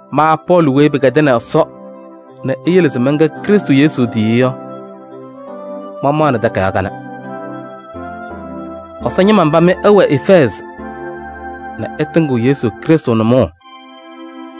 Ma Pɔɔlɩ weyi pɩkɛdɩnɩ Ɛsɔ nɛ eyele se mɛnkɛ Krɩstʋ Yesu tiyiyu yɔ, mamaɣnɩ takayaɣ kanɛ. Ɛsɔ ñɩma mba mɩ ɩwɛ Efɛɛzɩ nɛ ɩtɩŋɩɣ Krɩstʋ Yesu nʋmɔʋ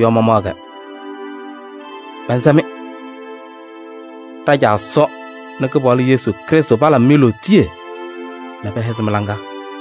yɔ mamaɣ-kɛ. Mɛnsɛ-mɩ: ɖa-Caa Ɛsɔ nɛ Kɩpaɣlʋ Yesu Krɩstʋ palabɩ-mɩ lootiye nɛ pɛhɛzɩ mɩ-laŋa.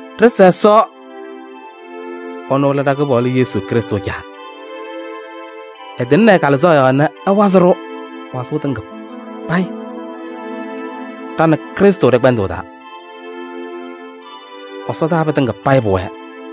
Ɖɩsa Ɛsɔ! Ɛnʋ lɛ ɖa-Kɩpaɣlʋ Yesu Krɩstʋ Caa. Ɛtɩŋnɩ ɛ-Kalɩzaɣ yɔɔ nɛ ɛwazɩ-ɖʋ wazʋʋ tɩŋa payɩ ɖa nɛ Krɩstʋ ɖɛ-kpɛndʋʋ taa, ɛsɔdaa pɩtɩŋa payɩ pʋwɛɛ.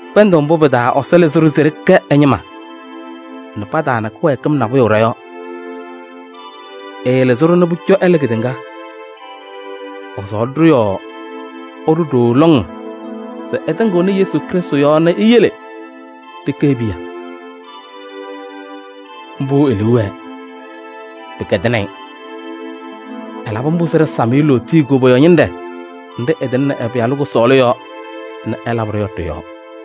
Kpɛndʋʋ mbʋ pɩ-taa Ɛsɔ lɩzɩ-ɖʋ se ɖɩkɛ ɛ-ñɩma nɛ pataana kɩwɛɛkɩm nabʋyʋ ɖɔ-yɔɔ. Ɛɛlɩzɩ-ɖʋ nɛ pʋcɔ ɛla kedeŋa. Ɛsɔɔlɩ-ɖʋ yɔɔ ɛɖʋ ɖooo lɔŋ se ɛtɩŋɩɣnɩ Yesu Krɩstʋ yɔɔ nɛ eyele ɖɩkɛ e-piya. Mbʋ e-liu wɛɛ, pɩkɛdɩnɩ-ɩ. Ɛlabɩ mbʋ se ɖɩsam-ɩ lootiye koboyaɣ ñɩnɖɛ nɖɩ ɛtɩŋnɩ ɛ-Pɩyalʋ kʋsɔɔlʋ yɔɔ nɛ ɛlabɩ-ɖʋ yɔ ɖɩ-yɔɔ.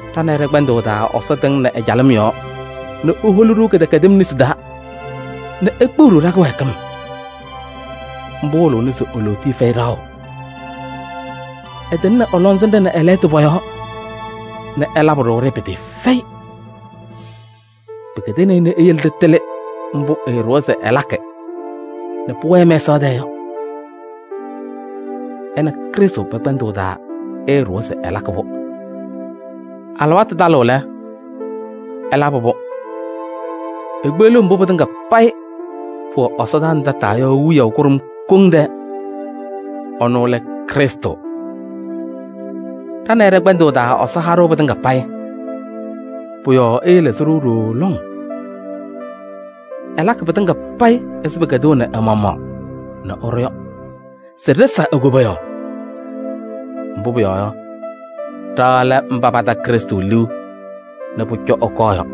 Ɖa nɛ ɩ ɖɛ-kpɛndʋʋ taa Ɛsɔ tɩŋnɩ ɛ-calɩm yɔɔ nɛ eholi-ɖʋ kɩdɛkɛdɩm nesi taa nɛ ekpeɣ-ɖʋ ɖa-kɩwɛɛkɩm. Mbʋ wɩlɩɣna se e-lootiye fɛyɩ ɖaɣʋ. Ɛtɩŋnɩ ɛ-lɔŋsɩnɖɛ nɛ ɛ-lɛɣtʋ pɔ-yɔɔ nɛ ɛlabɩ-ɖʋ-ɖɩ pɩtɩɩfɛyɩ. Pɩkɛdɩnɩ-ɩ nɛ eyele nɛ ɖɩtɩlɩ mbʋ ɛɛɖʋwa se ɛlakɩ nɛ pʋwɛɛ mɛsaɣ tɛɛ yɔ. Ɛ nɛ Krɩstʋ pɛ-kpɛndʋʋ taa ɛɛɖʋwa se ɛlakɩ-pʋ. Alɩwaatʋ talɩɣ lɛ, ɛlabɩ-pʋ: ekpeɣliɣ mbʋ pɩtɩŋa payɩ pʋwɛ ɛsɔdaa nɛ tataa yɔ wiyaʋ kʋɖʋm koŋ tɛɛ. Ɛnʋ lɛ Krɩstʋ. Ɖa nɛ ɩ ɖɛ-kpɛndʋʋ taa Ɛsɔ ha-ɖʋ pɩtɩŋa payɩ. Pʋ-yɔɔ ɛɛlɩzɩ-ɖʋ ɖooo lɔŋ. Ɛlakɩ pɩtɩŋa payɩ ɛzɩ pɩkɛdɩnaʋ ɛ-maɣmaɣ nɛ ɛɖʋ yɔ se ɖɩsa e-koboyaɣ. Mbʋ pʋyɔɔ yɔ, ɖa lɛ mba pata Krɩstʋ liu nɛ pʋcɔ ɛkɔɔ yɔ.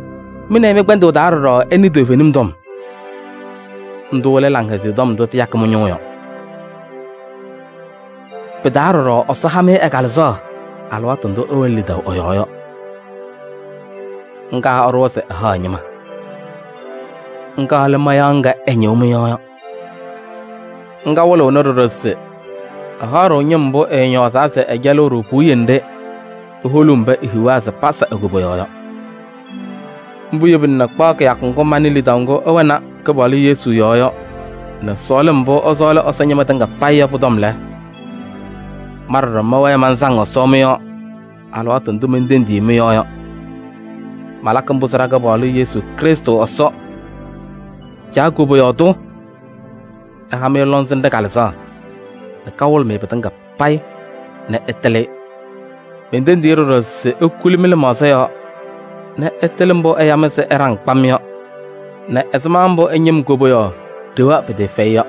Mɩ nɛ ɩ mɩ-kpɛndʋʋ taa ɖɔɖɔ ɩnɩ toovenim tɔm. Ndʋ lɛ Laŋhɛzɩyɛ Tɔm ndʋ tɩyakɩ mɩ-ñʋʋ yɔ. Pɩ-taa ɖɔɖɔ Ɛsɔ ha-mɩ ɛ-Kalɩzaɣ alɩwaatʋ ndʋ ɩwɛnɩ lidaʋ ɛ-yɔɔ yɔ. Ŋga ɛɖʋwa se ɛhaɣ ɛ-ñɩma. Ŋga lɛ mayaɣ ŋga ɛñɩɣ mɩ-yɔɔ yɔ. Ŋga wɩlɩɣnɩ ɖɔɖɔ se ɛhaɣ-ɖʋ ñɩm mbʋ ɛɛñɔɔzaa se ɛcɛlɩɣ-ɖʋ puwiye nɖɩ eholuu mba ehiɣa se pasa e-koboyaɣ yɔ. Mbʋ yebina nɛ kpaɣ kɩyakʋ ŋgʋ manɩ lidaʋ ŋgʋ ɩwɛnɩ Kɩpaɣlʋ Yesu yɔɔ yɔ nɛ sɔɔlɩm mbʋ ɩsɔɔlɩ Ɛsɔ ñɩma tɩŋa yɔ pɔ-tɔm lɛ, ma ɖɔɖɔ mɛwɛɛ mansaŋ Ɛsɔ mɩ-yɔɔ alɩwaatʋ ndʋ mentendiɣ-i mɩ-yɔɔ yɔ. Malakɩ mbʋ se ɖa-Kɩpaɣlʋ Yesu Krɩstʋ Ɛsɔ, Caa koboyaɣ tʋ ɛha-mɩ lɔŋsɩnɖɛ Kalɩzaɣ nɛ kawɩlɩ-mɩ pɩtɩŋa nɛ ɩtɩlɩ-ɩ. Mentendiɣ-i ɖɔɖɔ se ekuli mɩ-lɩmaɣza yɔɔ nɛ ɩtɩlɩ mbʋ ɛya-mɩ se ɩɖaŋ kpam yɔ nɛ ɛzɩma mbʋ ɛ-ñɩm koboyaɣ ɖewa pɩtɩɩfɛyɩ yɔ.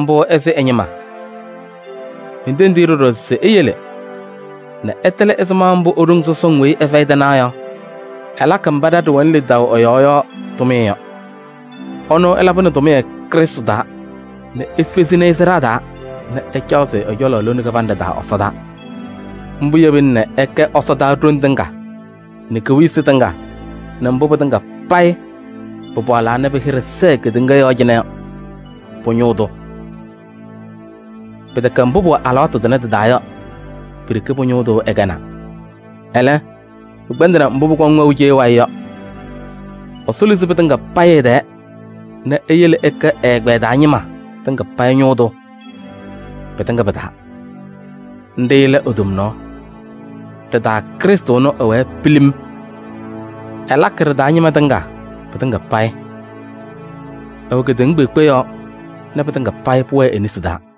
Mbʋ ɛsɩ ɛ-ñɩma. Mentendiɣ-i ɖɔɖɔ se eyele nɛ ɩtɩlɩ ɛzɩma mbʋ e-ɖoŋ sɔsɔŋ weyi ɛfɛyɩ tɩnaɣ yɔ, ɛlakɩ mba ɖa ɖɩwɛnɩ lidaʋ ɛ-yɔɔ yɔ tʋmɩyɛ yɔ. Ɛnʋ ɛlabɩnɩ tʋmɩyɛ Krɩstʋ taa nɛ efezini-i sɩɖaa taa nɛ ɛcaɣzɩ-ɩ ɛ-cɔlɔ lone kɩbanɖɛ taa ɛsɔdaa. Mbʋ yebina nɛ ɛkɛ ɛsɔdaa ɖoŋ tɩŋa nɛ kewiyisi tɩŋa nɛ mbʋ pɩtɩŋa payɩ pɩpaɣlaa nɛ pɩ-hɩɖɛ sɛɛ kedeŋa yɔɔ cɩnɛ yɔ pʋ-ñʋʋ tʋ. Pɩtɛkɛ mbʋ pʋwɛ alɩwaatʋ tʋnɛ tɩ-taa yɔ pi-ɖeke pʋ-ñʋʋ tʋ ɛkɛnaa, ɛlɛ, pɩkpɛndɩnɩ mbʋ pʋkɔŋ wɛʋ cee wayɩ yɔ. Ɛsɔ luzi pɩtɩŋa payɩ ɛ-tɛɛ nɛ eyele nɛ ɛkɛ ɛ-ɛgbɛyɛ taa ñɩma tɩŋa payɩ ñʋʋ tʋ pɩtɩŋa pɩ-taa. Nɖɩ lɛ e-tomnaɣ. Ɖɩ-taa Krɩstʋ ɛnʋ ɛwɛɛ pilim: ɛlakɩ ɖɩ-taa ñɩma tɩŋa pɩtɩŋa payɩ. Ɛwɛ kedeŋa kpeekpe yɔɔ nɛ pɩtɩŋa payɩ pʋwɛɛ e-nesi taa.